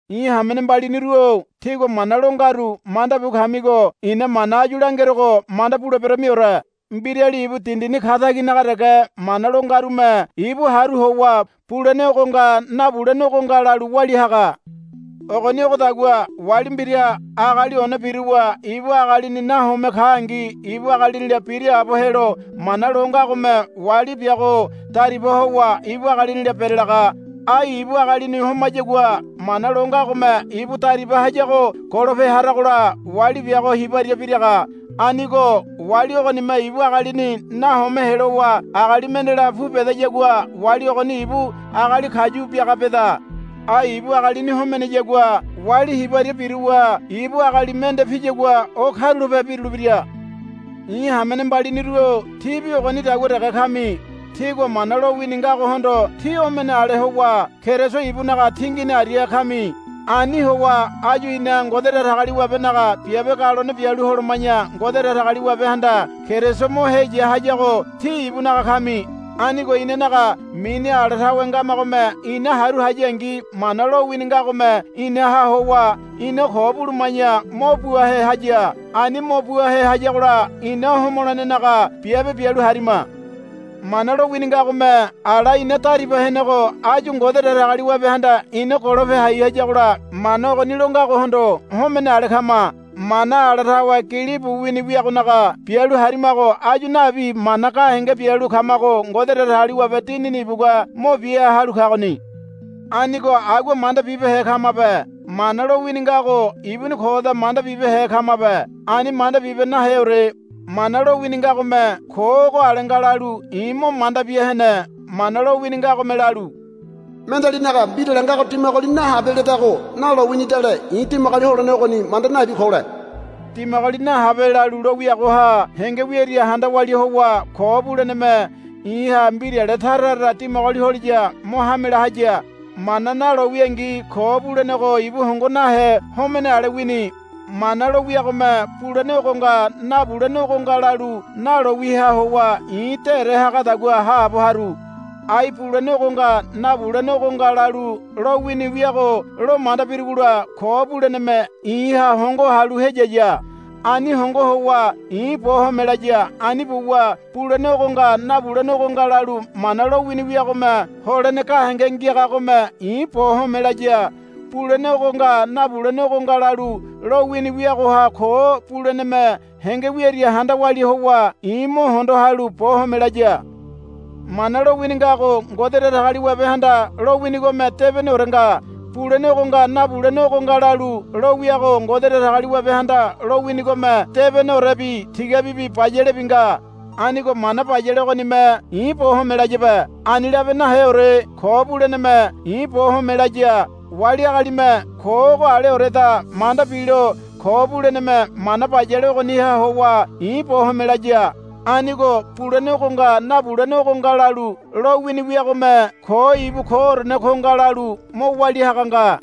I̱ hamene mbaliniru-o tígua mana lo ngaru manda bu kamigo i̱na mana áyu langerogo manda buleberamiore. Mbirali ibu dindini kataginaga dege mana lo ngarume ibu haru howa bulene ogo nga nabulene ogo nga lalu walia haga. Ogoni ogodagua wali mbira agali one biruwa ibu agalini nahome kangi ibu agalinila biraabo helo mana lo ngagome wali biago dariba howa ibu agalinila berelaga. Ai ibu agalini homayagua mana lo ngagome ibu dariba hayago golope haragola wali biago hibaria biraga. Anigo wali ogonime ibu agalini nahome helowa agali mendela pu bedayagua wali ogoni ibu agali kayu biaga beda. Ai ibu agalini homeneyagua wali hibaria biruwa ibu agali mende piyagua o karulape birulebira. I̱ hamene mbaliniru-o tíbi ogonidagua dege kami. Tígua Mana lowini ngagohondo tí homene ale howa Keriso ibunaga tingini aria kami. Ani howa áyu ina Ngode Datagaliwabenaga biabe galone bialu holoma̱ya Ngode Datagaliwabehanda Keriso mo heya hayago tí ibunaga kami. Anigo inanaga mini ala tawe ngamagome ina haru hayangi Mana lowini ngagome inaha howa ina ko buluma̱ya mo buahe haya. Ani mo buahe hayagola ina homolenenaga biabe bialu harima. Mana lowini ngagome ala ina dariba henego áyu Ngode Datagaliwabehanda ina golope hai hayagola Mana ogoni lo ngagohondo homene ale kama. Mana ala tawe gilibu wini wiagonaga bialu harimago áyu nabi mana gahenge bialu kamago Ngode Datagaliwabe Dinini ibugua mo bia halu kagoni. Anigo agua manda bibehe kamabe. Mana lowini ngago ibuni koda manda bibehe kamabe. Ani manda bibe naheore. Mana lowini ngagome ko ogo ale nga lalu i̱ mo manda bia hene. Mana lowini ngagome lalu, Mendealinaga mbirale ngago dimagoli nahabe, ledago nalo winidale i̱ dimagoli holene ogoni manda nabi kole. Dimagoli nahabe, lalu lo wiagoha henge wiaria handa walia howa ko buleneme i̱ha mbirale tara tara dimagoli holiya mo hamela haya. Mana nalo wiangi ko bulenego ibu hongo nahe homene ale wini. Mana lo wiagome bulene ogo nga nabulene ogo nga lalu nalo wiaha howa i̱ dére hagadagua haabo haru. Ai bulene ogo nga nabulene ogo nga lalu lowini wiago lo manda birugola ko buleneme i̱ha hongo halu heyaya. Ani hongo howa i̱ bo home laya. Ani buwa bulene ogo nga nabulene ogo nga lalu mana lowini wiagome holene gahenge ngiagagome i̱ bo home laya. Bulene ogo nga nabulene ogo nga lalu lowini wiagoha ko buleneme henge wiaria handa walia howa i̱ mo hondo halu bo home laya. Mana lowini ngago Ngode Datagaliwabehanda lowinigome debeneore nga. Bulene ogo nga nabulene ogo nga lalu lowiago Ngode Datagaliwabehanda lowinigome debeneorebi tigabibi bayalebi nga. Anigo mana bayale ogonime i̱ bo home layabe. Ani labe naheore. Ko buleneme i̱ bo home laya. Wali agalime ko ogo aleoreda manda bilo ko buleneme mana bayale ogoniha howa i̱ bo home laya. Anigo bulene ogo nga nabulene ogo nga lalu lowini wiagome ko ibu koorene ko nga lalu mo walia haga nga.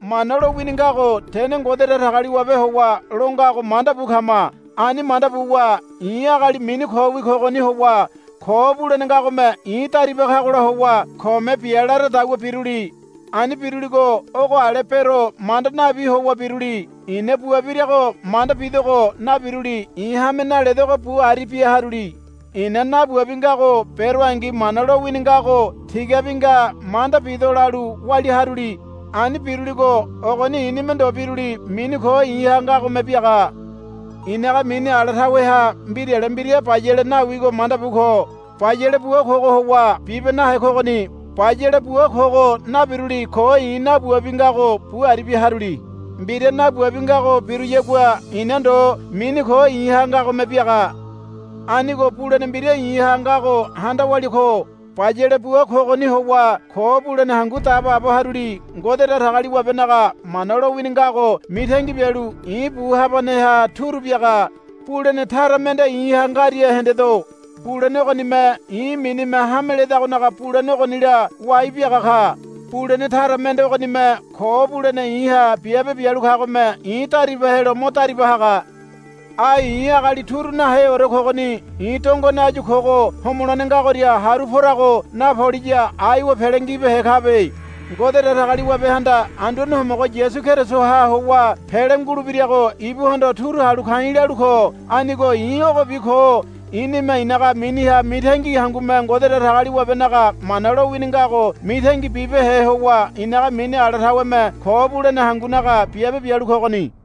Mana lowini ngago tene Ngode Datagaliwabe howa longago manda bu kama. Ani manda buwa i̱ agali mini kowi kogoni howa ko bulene ngagome i̱ dariba kagola howa kome bia laradagua biruli. Ani biruligo ogo ale bero manda nabi howa biruli. I̱na bua birago manda bidogo nabiruli i̱ hame naledogo bu aribia haruli. I̱na nabuabi ngago beroangi Mana lowini ngago tigabi nga manda bido lalu walia haruli. Ani biruligo ogoni i̱nime ndo biruli mini ko i̱ha ngagome biaga. i̱naga mini ala taweha mbirale mbira bayale nawigo manda bu ko. Bayale bua kogo howa bibe nahe kogoni. Bayale bua kogo nabiruli ko i̱ nabuabi ngago bu aribia haruli. Mbira nabuabi ngago biruyagua i̱na ndo mini ko i̱ha ngagome biaga. Anigo bulene mbira i̱ha ngago handa walia ko. Bayale bua kogoni howa ko bulene hangu dabaabo haruli. Ngode Datagaliwabenaga mana lowini ngago mitangi bialu i̱ bu habaneha turu biaga. Bulene tara mende i̱ha ngaria hendedo. Bulene ogonime i̱ minime hame ledagonaga bulene ogonila wai biaga ka. Bulene tara mende ogonime ko bulene i̱ha biabe bialu kagome i̱ dariba helo mo dariba haga. Ai i̱ agali turu naheore kogoni. I̱ dongone áyu kogo homolene ngagoria haru porago napoliya aiwa pele ngibehe kabe. Ngode Datagaliwabehanda Anduane Homogo Yasu Kerisoha howa pele ngulebirago ibuhondo turu halu ka̱i̱ lalu ko. Anigo i̱ ogobi ko. I̱nime i̱naga miniha mitangi hangume Ngode Datagaliwabenaga mana lowini ngago mitangi bibehe howa i̱naga mini ala taweme ko bulene hangunaga biabe bialu kogoni.